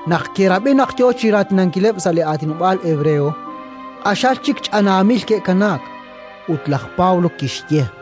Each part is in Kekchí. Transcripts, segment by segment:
Naq ke'rab'i naq yo chi raatinankileb' sa' aatinob'aal hebreo, q'axal chik ch'anaamil ke'kanaak. Ut laj Pablo kixye: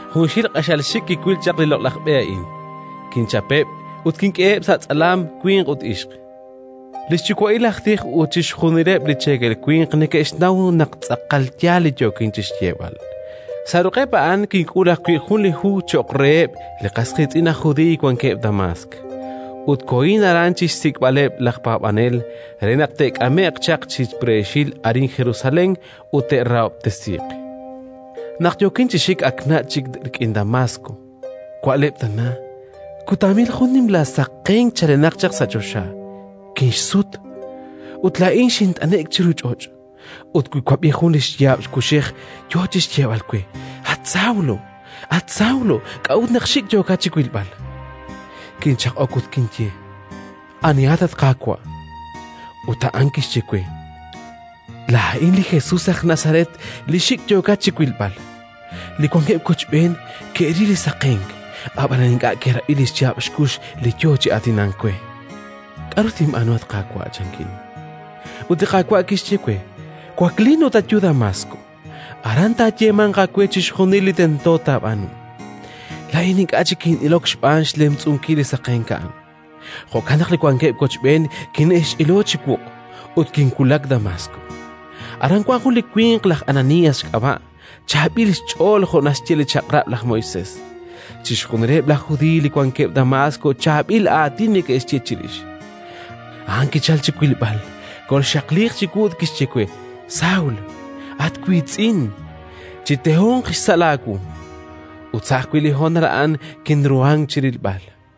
Junxil q'axal xik' kiwil li neke'taaqenk re li loq'laj B'e a'an: kinchapeb' ut kink'eheb' sa' tz'alam winq ut ixq. Li xyuwa'il aj tij ut chixjunileb' li cheekel winq neke'xnaw naq tz'aqal yaal li yookin chi xyeeb'al. Sa' ruq'eb' a'an kink'ul ajwi' jun li hu cho'q reheb' li qas qiitz'in aj Judiiy wankeb' Damaask; ut kohin aran chi xsik'b'aleb' laj paab'anel re naq te'k'ame'q chaq chi preexil arin Jerusalén ut te'rahob'tesiiq. “Naq yookin chi xik, ak nach' chik rik'in Damaask, wa'leb' tana, k'utaamil jun nimla saqenk chalenaq chaq sa' choxa. Kinxsut, ut laa'in kint'ane'k chiru ch'och' ut kiwab'i jun xyaab' kuxej yo chi xyeeb'al we: «At Saúl, at Saúl, k'a'ut naq xik' yookat chi wilb'al?». Kinchaq'ok ut kinye: «Anihat, at Qaawa'?» Ut a'an kixye we: «Laa'in li Jesus aj Nazaret li xik' yookat chi wilb'al». Li wankeb' wochb'een ke'ril li saqenk, ab'anan ink'a' ke'rab'i li xyaab' xkux li yo chi aatinank we. «K'aru tinb'aanu, at Qaawa'?», chankin. Ut li Qaawa' kixye we: «Waklin ut ayu Damaask; aran taayeemanq aawe chixjunil li tento taab'aanu». Laa'in ink'a' chik kin'ilok xb'aan xlemtz'unkil li saqenk a'an, jo'kan naq li wankeb' wochb'een kine'xch'ilo chi wuq', ut kinwulak Damaask. “Aran wank jun li winq, aj Ananías xk'ab'a', chaab'il xch'ool jo' naxye li xChaq'rab' laj Moisés; chixjunileb' laj Judiiy li wankeb' Damaask chaab'il aatin neke'xye chirix. A'an kichalk chi wilb'al, kolxaqliiq chiwu ut kixye we: «Saúl, at wiitz'in, chitehonq xsa' laawu». Ut sa' ajwi' li honal a'an kinruhank chi rilb'al.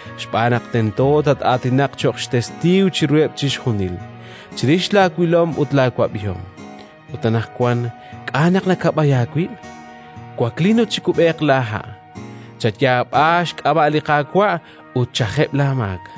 Xb'aan naq tento tat-aatinaq cho'q xtestiiw chiruheb' chixjunil, chirix laawilom ut laawab'ihom. Ut anaqwan, k'a' naq nakab'ay aawib'? Waklin ut chikub'eeq laaha'! Chayaab'a xk'ab'a' li Qaawa' ut ch'ajeb' laamaak».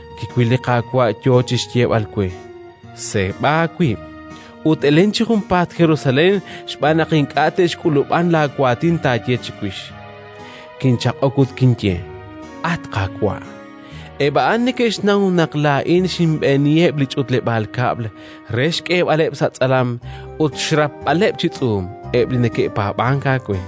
kiwil li Qaawa' yo chi xyeeb'al we: «Seeb'a aawib' ut elen chi junpaat Jerusalén xb'aan naq ink'a' te'xk'ulub'an laawaatin taaye chiwix». “Kinchaq'ok ut kinye: «At Qaawa', eb' a'an neke'xnaw naq laa'in xinb'eeniheb' li ch'utleb'aal kab'l re xk'eeb'aleb' sa' tz'alam ut xrapb'aleb' chi tz'uum eb' li neke'paab'ank aawe.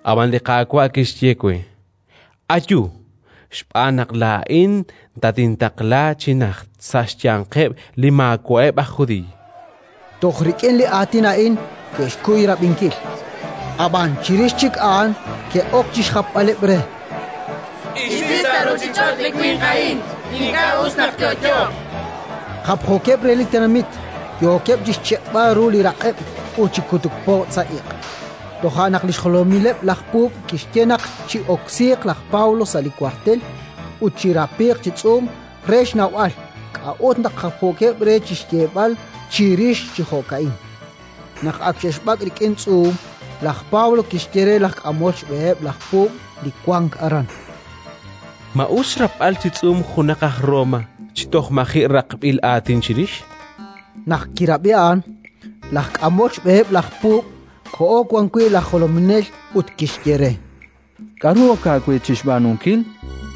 Ab'an li Qaawa' kixye we: «Ayu, xb'aan naq laa'in tatintaqla chi najt, sa' xyanqeb' li maawa'eb' aj Judiiy»”. Toj rik'in li aatin a'in ke'xkuy rab'inkil; ab'an chirix chik a'an ke'ok chi xjapb'aleb' re: “Isi sa' ruuchich'och' li winq a'in! Ink'a' us naq yo'yooq”, chankeb'. Japjookeb' re li tenamit, yookeb' chi xchiq'b'al ru li raq'eb' ut chi kutuk pojtz' sa' iq'. Toja' naq li xjolomileb' laj puub' kixye naq chi'oksiiq laj Pablo sa' li wartel ut chirapiiq chi tz'uum re xnawb'al k'a'ut naq japjookeb' re chi xyeeb'al chirix chi jo'ka'in. Naq ak xe'xb'ak' rik'in tz'uum, laj Pablo kixye re laj k'amol xb'eheb' laj puub' li wank aran: —Ma us xrapb'al chi tz'uum junaq aj Roma chi toj maji' raqb'il aatin chirix? Naq kirab'i a'an, laj k'amol xb'eheb' laj puub' koho wan wi' laj jolominel ut kixye re: —K'aru ok aawe chi xb'aanunkil?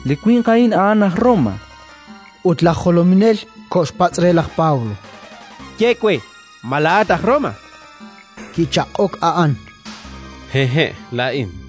Li winq a'in a'an aj Roma. Ut laj jolominel koxpatz' re laj Pablo: —Ye we, ma laa'at aj Roma? Kichaq'ok a'an: —Hehe', laa'in, chan.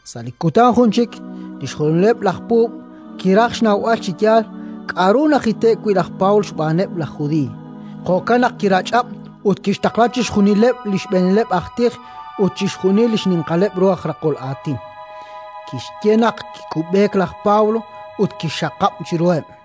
Sa' li kutan jun chik li xjolomileb' laj puub' kiraj xnawb'al chi yaal k'aru najite'k wi' laj Pablo xb'aaneb' laj Judiiy; jo'kan naq kirach'ab' ut kixtaqla xch'utub'ankileb' li xb'eenileb' aj tij ut chixjunil li xninqaleb' ru aj raqol aatin. Kixye naq chikub'eeq laj Pablo ut kixxaqab' chiruheb'.